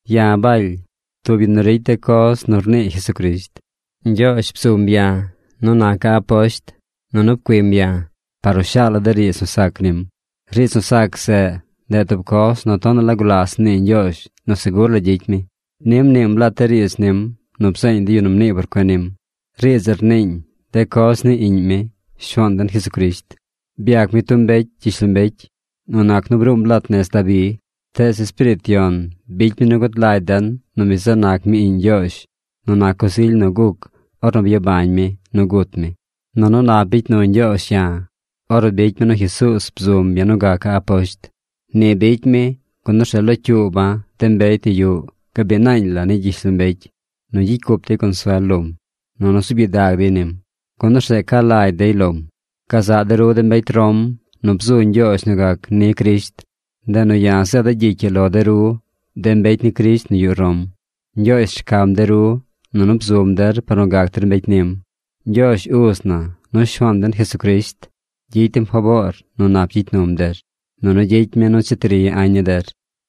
Ya̱ Baly, tub yu nu ricy de coz nu rnii Jesucrisht. Ñgyoozh bzum ya̱ nu naca̱ aposht nunu pcuim ya̱ par nu shaala̱ de riidz nu sac nim. Riidz nu sac zeꞌ, ndeꞌ tub coz nu tonaꞌ la gulas mnii Ñgyoozh nu segur la gyicy mi. Ni mniim lat de riidz nim nu bzeeñ de yu nu mnii por cuen nim. Riidz zeꞌ rniiñ de coz ni Iꞌñ mi, Shuaan den Jesucrisht. Byac mi tub mbecy gyishlombecy nu nac nu bruum lat nez Dabi. Tees Espiriit Yon bicy mi nu gud lagy den nu mi zeꞌ nac mi iꞌñ Ñgyoozh nu nac coz ily nu guc ornu byabañ mi nu gut mi. Nunu nap bicy nu Ñgyoozh ya̱ ornu bicy mi nu Jesuuz bzum ya̱ nu gaca̱ aposht. Ni bicy mi, gun orzeꞌ locyuuba̱ de mbecy nu yuꞌ gabiꞌ naañ la ni gyishlombecy nu gyicy cup dey consuel lom, nunu zuub gyidag dey nim, gun orzeꞌ ca lagy dey lom. Gazaꞌ de ru de mbecy Rom nu bzu Ñgyoozh nu gac ni Crisht. Ndeꞌ nu ya̱ zeeda̱ gyicy ii lo de ru, de mbecy ni Crisht nu yuꞌ Rom. Ñgyoozh rcam de ru, nunu bzum der par nu gac der mbecy nim. Ñgyoozh Uz na nu Shuaan den Jesucrisht gyicy dem faboor nu nap gyicy num der, nunu gyicy mi nu cheti ri añ ni der.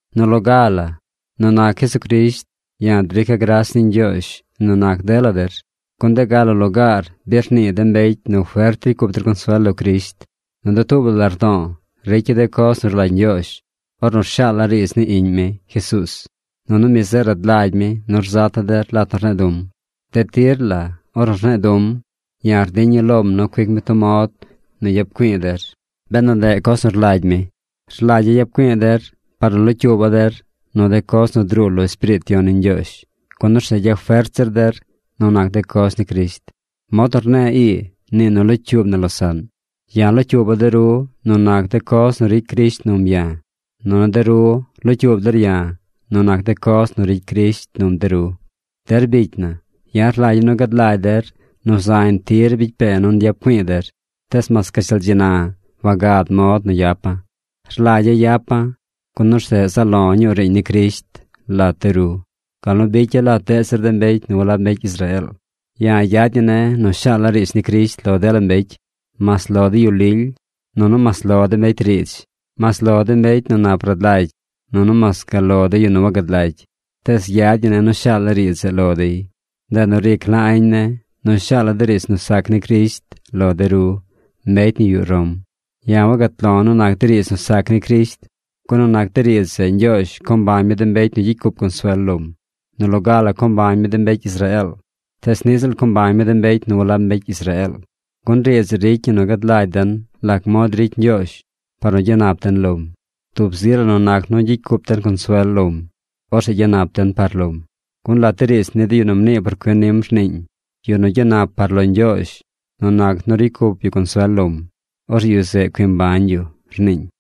Nu loga la, nu nac Jesucrisht ya̱ drica̱ gras ni Ñgyoozh nu nac dela der, gun de ga la lugaar bi rnii de mbecy nu fert ricy cup der consuel lo Crisht. Nu dutuub la lardo̱o̱, ricya̱ de coz nu rlagy Ñgyoozh ornu rshaala̱ riidz ni Iꞌñ mi, Jesuuz. Nunu mi zeꞌ rad lagy mi nu rzata̱ der lat nu rne̱e̱ du̱m. De tir la ornu rne̱e̱ du̱m, ya̱ rdiña̱ lom nu cuic mi tub mod nu yap güi̱i̱ der, benu ndeꞌ coz nu rlagy mi. Rlagya̱ yap güi̱i̱ der par nu locyuuba̱ der nu de coz nu druu lo Espiriit Yon ni Ñgyoozh, gun orzeꞌ gyafert zir der nu nac de coz ni Crisht. Mod nu rne̱e̱ ii, nii nu locyuub na losaꞌn. Ya̱ locyuuba̱ de ru nu nac de coz nu ricy Crisht num ya̱, nunu de ru locyuub der ya̱ nu nac de coz nu ricy Crisht num de ru. Der bicy na, ya̱ rlagya̱ nu gad lagy der nu zañ tir bicy pe̱e̱ nu nyap güi̱i̱ der, tees mas gashtal dzi na wagad mod nu yapa̱. Rlagya̱ yapa̱, gun orzeꞌ zaꞌ lo̱ ñuu riiñ ni Crisht lat de ru, gal nu bicya̱ lat deꞌ zir de mbecy nu walab mbecy Israeel. Ya̱ yad ñi ne̱ nu shaala̱ riidz ni Crisht lo dela mbecy: mas lo de yu lily, nunu mas lo de mbecy riidz, mas lo de mbecy nu nap rad lagy, nunu mas gal lo de yu nu wagad lagy, tees yad ñi ne̱ nu shaala̱ riidz zeꞌ lo dey. Ndeꞌ nu ric la añ ne̱ nu shaala̱ de riidz nu sac ni Crisht lo de ru, mbecy nu yuꞌ Rom. Ya̱ wagat lo̱ nu nac de riidz nu sac ni Crisht, gun nu nac de riidz zeꞌ Ñgyoozh co mbañ mi de mbecy nu gyicy cup consuel lom. Nu loga la co mbañ mi de mbecy Israeel, tees niꞌ ziꞌl co mbañ mi de mbecy nu walab mbecy Israeel. Gun riidz zeꞌ ricy ñi nu gad lagy den lac mod ricy Ñgyoozh par nu gyanap den lom. Tub zi la nu nac nu gyicy cup den consuel lom, orzeꞌ gyanap den par lom. Gun lat de riidz ni de yu nu mnii por cuen nim rniiñ: “Yu nu gyanap par lo Ñgyoozh nu nac nu ricy cup yu consuel lom, orzeꞌ yu zeꞌ cui mbañ yu”, rniiñ.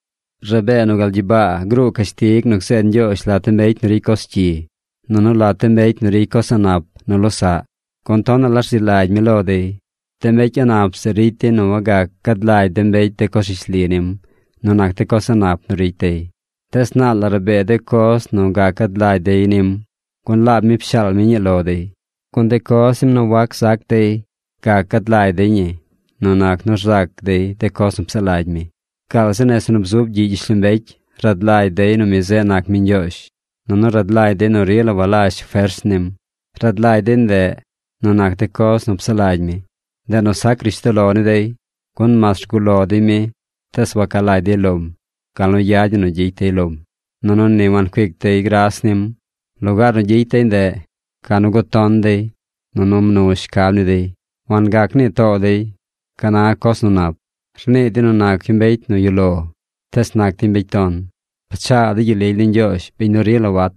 Rabee nu gal gyibaa gruu cashtig nu gzeed Ñgyoozh lat de mbecy nu ricy coz cyi, nunu lat de mbecy nu ricy coz a̱ꞌ nap nu losaꞌ, gun tonaꞌ la rzi lagy mi lo dey. De mbecy a̱ꞌ nap zeꞌ ricy dey nu wagac gad lagy de mbecy de coz rishli nim nu nac de coz a̱ꞌ nap nu ricy dey. Tees naal la rabee de coz nu gac gad lagy dey nim, gun laab mi pshaal mi ñii lo dey. Gun de coz nim nu wac zac dey, gac gad lagy dey ñi nu nac nu rzac dey de coz nu psaꞌ lagy mi. Gaal zi nese nu bzub gyiꞌ gyishlombecy rad lagy dey nu mi zeꞌ nac mi Ñgyoozh, nunu rad lagy dey nu rila walazh fers nim. Rad lagy dey ndeꞌ nu nac de coz nu psaꞌ lagy mi. Ndeꞌ nu sac rishtoꞌ lo ni dey. Gun mas rguꞌ lo dey mi, tees waca lagy dey lom gal nu yad ñi nu gyicy dey lom, nunu ni wancuic dey gras nim. Lugaar nu gyicy dey ndeꞌ, ca nu guton too dey, nunu mnu shcab ni dey. Wangac nii too dey ca na coz nu nap. Rnii dey nu nac yu mbecy nu yuꞌ lo, tees nac dey mbecy ton. Pchaa dey gyel lily ni Ñgyoozh biñ nu rila wat.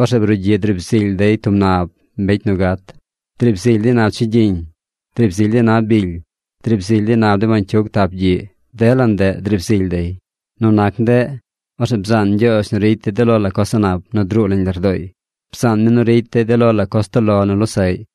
Orzeꞌ brugyiꞌ driib zily dey tub nab mbecy nu gat. Driib zily dey nab chigyiñ, driib zily dey nab bily, driib zily dey nab de bañcyug tap gyiꞌ. Dela ndeꞌ driib zily dey. Nu nac de ndeꞌ, orzeꞌ bzaan Ñgyoozh nu ricy dey de lo la coz a̱ꞌ nap nu druu nañ lardooy. Bzaan mi nu ricy dey de lo la coz toꞌ lo nu losaꞌy.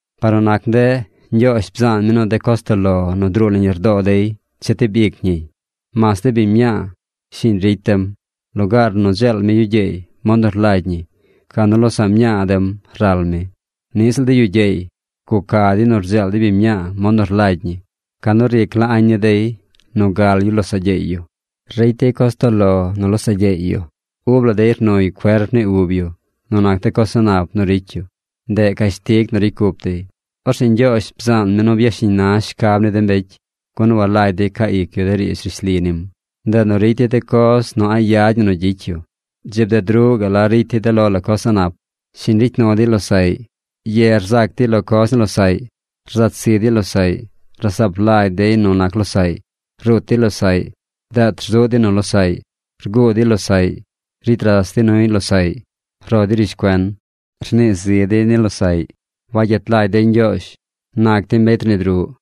Par nu nac ndeꞌ, Ñgyoozh bzaan mi nu de coz toꞌ lo nu druu nañ lardoo dey chetib ic ñiy. Mas de biñ mñaa shiñ ricy dem. Lugaar nu dzeel mi yu gyeey mod nu rlagy ñi, ca nu losaꞌ mñaa dem ral mi. Niꞌ ziꞌl de yu gyeey. Guca dey nu rdzeel dey biñ mñaa mod nu rlagy ñi. Ca nu ric la añ ni dey nu gal yu losaꞌ gyeey yu. Ricy dey coz toꞌ lo nu losaꞌ gyeey yu. Ub la dey rnuy cuerp ni ub yu nu nac de coz a̱ꞌ nap nu ricy yu. Ndeꞌ cashtig nu ricy cup dey. Orzeꞌ Ñgyoozh bzaan mi nu byashiñ na shcab ni de mbecy, gun walagy dey caa ic yu de riidz rishli nim. Ndeꞌ nu ricy dey de coz nu a̱ꞌ yad ñi nu gyicy yu. Dzi bded ruꞌ gaꞌ ricy dey de lo la coz a̱ꞌ nap. Shiñ ricy nu dey losaꞌy. Ye rzac dey lo coz ni losaꞌy. Rzat zi dey losaꞌy. Rasaap lagy dey nu nac losaꞌy. Rut dey losaꞌy. Deet rzuꞌ dey nu losaꞌy. Rguu dey losaꞌy. Ricy ras dey nuy losaꞌy. Ro dey rishcuen. Rnii zi dey ni losaꞌy. Wayet lagy dey Ñgyoozh. Nac dey mbecy rnid ruꞌ.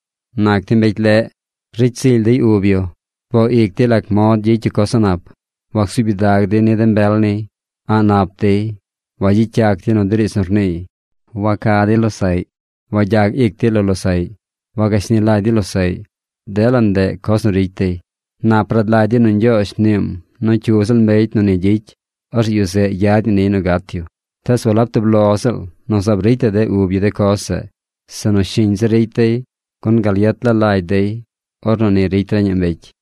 Nac dey mbecy leꞌ. Ricy zily dey ub yu. Rboo ic dey lac mod gyicy yu coz a̱ꞌ nap. Wacsuub gyidag dey ni de mbel niy. A̱ꞌ nap dey. Wagyicy yac dey nu de riidz nu rniiy. Waca dey losaꞌy. Wagyag ic dey lo losaꞌy. Wagashni lagy dey losaꞌy. Dela ndeꞌ coz nu ricy dey. Nap rad lagy dey nu Ñgyoozh mniim nu cyu ziꞌl mbecy nu ni gyicy, orzeꞌ yu zeꞌ yad ñi niy nu gat yu. Tees walab tub lo ziꞌl nu zaab ricy la de ub yu de coz zeꞌ, sinu shiñ zir ricy dey, gun gal yet la lagy dey ornu ni ricy reñaꞌ mbecy.